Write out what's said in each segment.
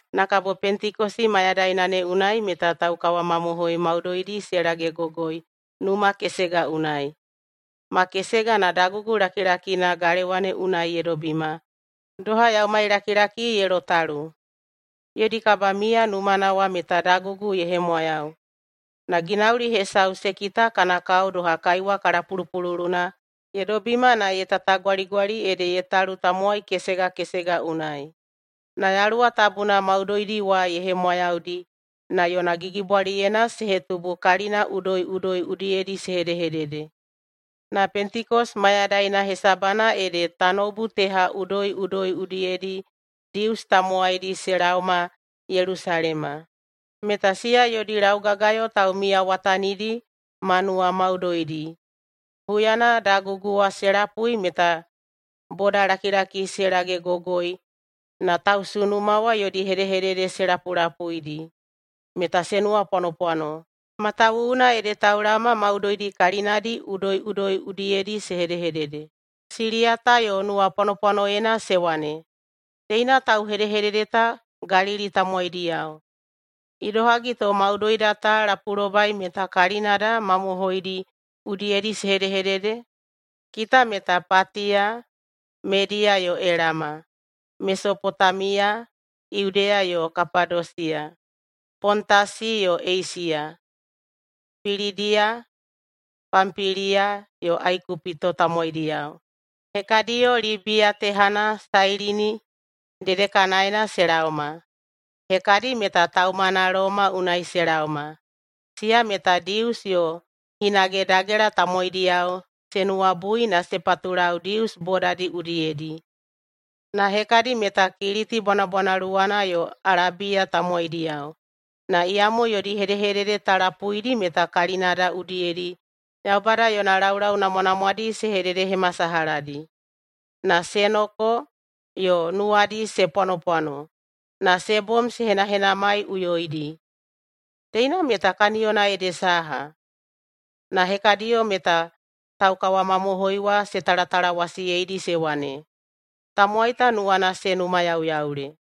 Na kabo Pentekosi mayadaina ne unai meta taukawamamohoi maudoidi se lagegogoi numa kesega unai. Makesega na dagugu lakilakina galewa ne unai ye dobima doha yaumailakilaki ye lotalu. Yodi kabamiya numana wa meta dagugu ye hemwayau. Na ginauli hesau se kita kana kao doha kaiwa kalapulupululuna ye dobima na ye tatagwaligwali ede ye talu tamowai kesega kesega unai. Na Yaluwa Tabuna maudoidi wa ye hemwayaudi na yona gigibwaliyena se hetubu kalina udoiꞌudoi udiyedi se hedehedede. Na [Pentekosi mayadaina hesabana ede] tanoubu teha udoiꞌudoi udiyedi Dius tamowaidi se laoma Yelusalema, meta siya yodi laugagayo taumiyawatanidi ma nuwamaudoidi. Huyana dagugu wa se lapui meta bodalakilaki se lagegogoi na tausunuma wa yodi hedehedede se lapulapuidi meta se nuwapwanopwano, matawuwuna ede taulaoma maudoidi kalinadi udoiꞌudoi udiyedi se hedehedede. Siliyata yo nuwapwanopwanoyena se wane, “Teina tauhedehedede ta Galili tamowaidiyao. Idohagi to maudoida ta lapulobai meta kalinada mamohoidi udiyedi se hedehedede? Kita meta Patiya, Mediya yo Elama, Mesopotamiya, Yudeya yo Kapadosiya, Pontasi yo Eisiya, Pilidiya, Pampiliya yo Aikupito tamowaidiyao. Hekadiyo Libiya tehana Sailini dedekanaena se laoma. Hekadi meta taumana Loma unai se laoma, siya meta Dius yo hinage dagela tamowaidiyao se nuwabui na se patulau Dius bodadi udiyedi. Na hekadi meta Kiliti bwanabwanaluwana yo Alabiya tamowaidiyao. Na iyamo yodi hedehedede ta lapuidi meta kalinada udiyedi Yaubada yona laulau namwanamwadi se hededehemasalahadi.” Na se noko, yo nuwadi se pwanopwano, na se bom se henahenamaiꞌuyoidi, “Teina meta kaniyona ede saha?” Na hekadiyo meta taukawamamohoi wa se talatalawasiyeidi se wane, “Tamowai ta nuwana se numayauyaule!”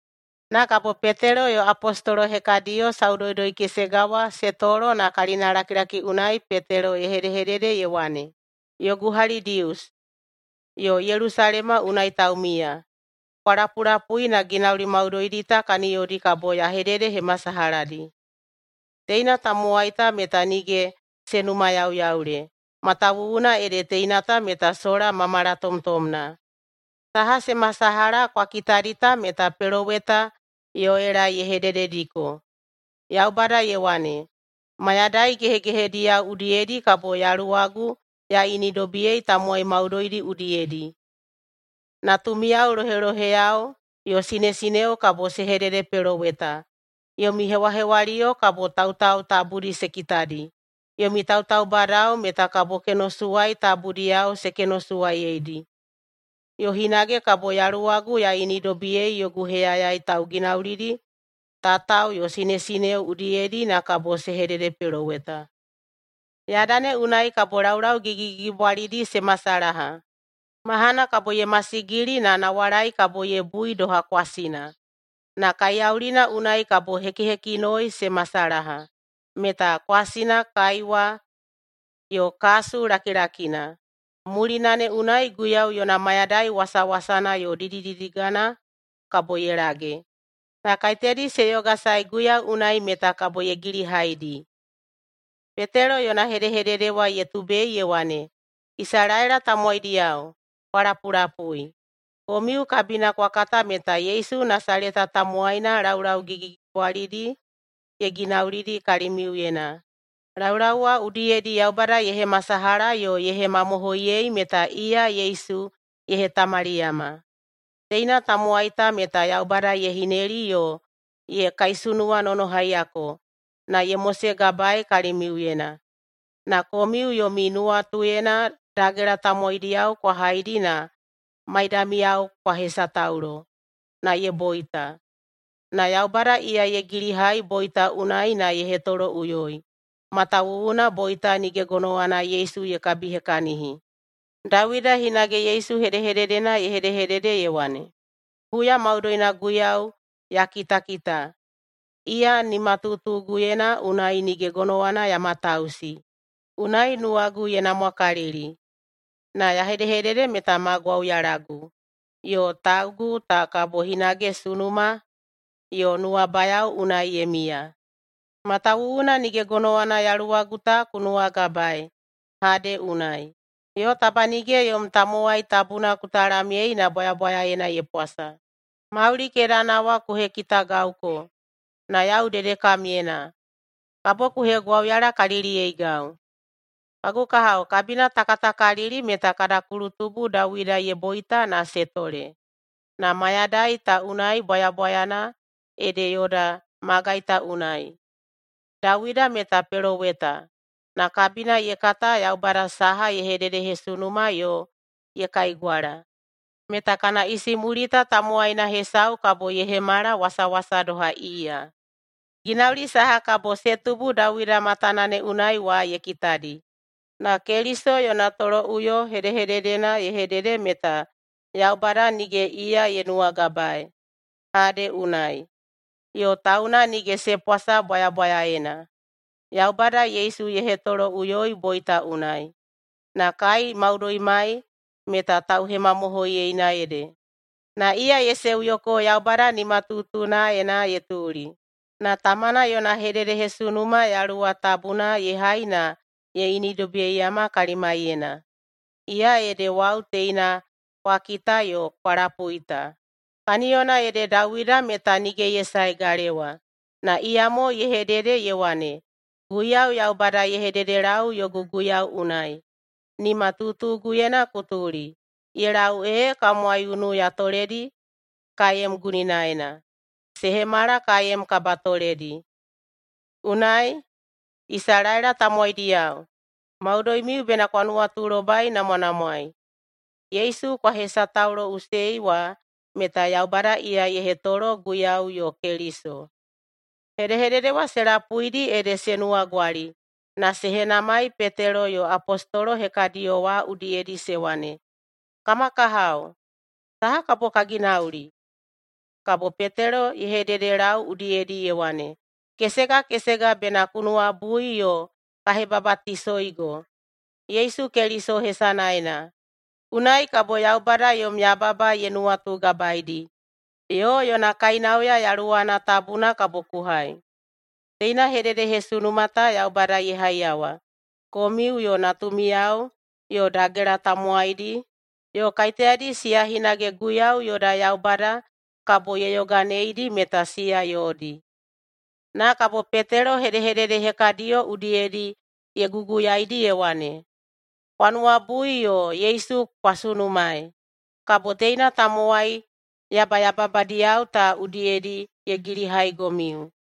Na kabo [Petelo yo] apostolo [hekadiyo] saudoudoi-kesega wa se tolo na kalinalakilaki unai Petelo ye hedehedede ye wane, “Yogu hali Dius, yo Yelusalema unai taumiya, kwa lapulapui na ginauli maudoidi ta kaniyodi kabo ya hededehemasalahadi. Teina tamowai ta meta nige se numayauyaule matawuwuna ede teina ta meta sola ma malatomtomna. Saha se masalaha kwa kitadi ta meta peloweta Yoela ye hededediko, ‘Yaubada ye wane, “Mayadai gehegehediyao udiyedi kabo Yaluwagu ya inidobiyei tamowai maudoidi udiyedi. Natumiyao loheloheyao yo sinesineo kabo se hededepeloweta. Yomi hewahewaliyo kabo tautau tabudi se kitadi. Yomi tautaubadao meta kabo kenosuwai tabudiyao se kenosuwaiyedi. Yo hinage kabo Yaluwagu ya inidobiyei yogu heyayai tauginaulidi tatao yo sinesineo udiyedi na kabo se hededepeloweta. Yada ne unai kabo laulau gigigigibwalidi se masalaha. Mahana kabo ye masigili na nawalai kabo ye bui doha kwasina. Na kaiyaulina unai kabo hekihekinoi se masalaha, meta kwasina, kaiwa, yo kasu lakilakina. Mulina ne unai Guiyau yona mayadai wasawasana yo didididigana kabo ye lage. Na kaiteyadi se yogasae Guiyau unai, meta kabo ye gilihaidi.”’” [Petelo yona hedehedede wa ye tubei ye wane,] “Isalaela tamowaidiyao, kwa lapulapui! Komiu kabina kwa kata meta Yesu Nasaleta tamowaina laulau gigigigibwalidi ye ginaulidi kalimiuyena. Laulau wa udiyedi Yaubada ye hemasalaha yo ye hemamohoiyei meta iya Yesu ye hetamaliyama. Teina tamowai ta meta Yaubada ye hineli yo ye kaisunuwanonohaiyako na ye mosegabaei kalimiuyena. Na komiu yomi nuwatuyena dagela tamowaidiyao kwa haidi na maidamiyao kwa hesataulo, na ye boita. Na Yaubada iya ye gilihai boita unai na ye hetoloꞌuyoi, matawuwuna boita nige gonowana Yesu ye kabihekahini. Dawida hinage Yesu hedehededena ye hedehedede ye wane, ‘Huya maudoina Guiyau ya kitakita. Iya nimatutuguyena, unai nige gonowana ya matausi. Unai nuwagu ye namwakalili, na ya hedehedede meta ma gwauyalagu, yo taugu ta kabo hinage sunuma yo nuwabayao unai ye miya, matawuwuna nige gonowana yaluwagu ta ku nuwagabaei Hade unai, yo taba nige yom tamowai tabuna ku talamyei na bwayabwayaena ye pwasa. Mauli kedana wa ku hekitagauko, na yau dedekamyena, kabo ku hegwauyalakaliliyeigau.’ Kagu kahao, kabina ta katakalili meta kada kulutubu Dawida ye boita na se tole, na mayadai ta unai bwayabwayana ede yoda magai ta unai. Dawida meta peloweta, na kabina ye kata Yaubada saha ye hededehesunuma yo ye kaigwala, meta kana isimulita tamowaina hesau kabo ye hemala wasawasa doha iya. Ginauli saha kabo se tubu Dawida matana ne unai wa ye kitadi, na Keliso yona toloꞌuyo hedehededena ye hedede meta Yaubada nige iya ye nuwagabaei Hade unai, yo tauna nige se pwasa bwayabwayaena. Yaubada Yesu ye hetoloꞌuyoi boita unai, na kai maudoimai meta tauhemamohoiyena ede. Na iya ye seuyoko Yaubada nimatutunaena ye tuli, na tamana yona hedehededehesunuma Yaluwa Tabuna ye hai na ye inidobiyeiyama kalimaiyena. Iya ede wau teina kwa kita yo kwa lapui ta. Kaniyona ede Dawida meta nige ye sae galewa, na iyamo ye hedede ye wane, ‘Guiyau Yaubada ye hededelau yogu guiyau unai, “Nimatutuguyena ku tuli, ye lau ee kam waiunu ya toledi kaem guninaena, se hemala kaem kabatoledi.” ’ Unai, Isalaela tamowaidiyao, maudoimiu bena kwa nuwatulobainamwanamwai, Yesu kwa hesatauloꞌusei wa meta Yaubada iya ye hetolo Guiyau yo Keliso.” Hedehedede wa se lapuidi ede se nuwagwali na se henamai Petelo yo apostolo hekadiyo wa udiyedi se wane, “Kama kahao, saha kabo ka ginauli?” Kabo Petelo ye hededelau udiyedi ye wane, “Kesega kesega bena ku nuwabui yo ka hebabatisoigo Yesu Keliso hesanaena, unai kabo Yaubada yom yababa ye nuwatugabaeidi, yo yona kainauya Yaluwana Tabuna kabo ku hai. Teina hedehededehesunuma ta Yaubada ye haiyawa komiu yo natumiyao yo dagela tamowaidi, yo kaiteyadi siya hinage Guiyau yoda Yaubada kabo ye yoganeidi meta siya yodi.” Na kabo Petelo hedehedede hekadiyo udiyedi ye guguyaidi ye wane, “Kwa nuwabui yo Yesu kwa sunumaei, kabo teina tamowai yabayababadiyao ta udiyedi ye gilihaigomiu.”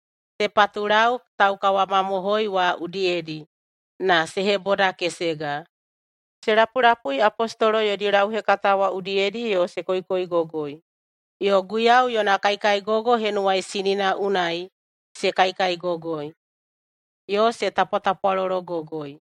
Se patulau taukawamamohoi wa udiyedi na se hebodakesega. Se lapulapui apostolo yodi lauhekata wa udiyedi yo se koikoigogoi, yo Guiyau yona kaikaigogo henuwaisinina unai se kaikaigogoi, yo se tapwatapwalologogoi.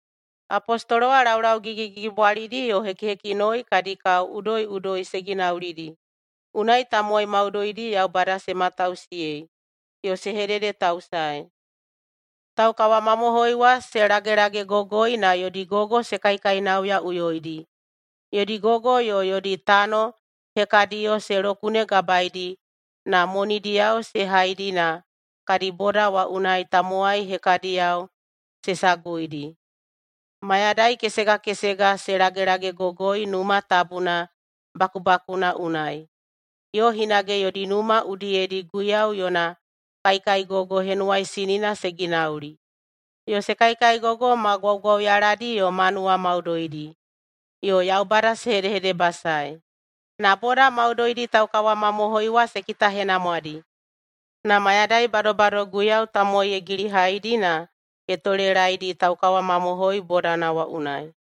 Apostolo wa laulau gigigigibwalidi yo hekihekinoi kadi kao udoiꞌudoi se ginaulidi. Unai tamowai maudoidi Yaubada se matausiyei yo se hededetausaei. Taukawamamohoi wa se lagelagegogoi na yodi gogo se kaikainauyaꞌuyoidi. Yodi gogo yo yodi tano hekadiyo se lokunegabaeidi na monidiyao se haidi na kadi boda wa unai tamowai hekadiyao se saguidi. Mayadai kesega kesega se lagelagegogoi Numa Tabuna bakubakuna unai. Yo hinage yodi numa udiyedi Guiyau yona kaikaigogo henuwaisinina se ginauli, yo se kaikaigogoi ma gwaugwauyaladi yo ma nuwamaudoidi, yo Yaubada se hedehedebasaei. Na boda maudoidi taukawamamohoi wa se kitahenamwadi. Na mayadai badobado Guiyau tamowai ye gilihaidi na ye tolelaedi taukawamamohoi bodana wa unai.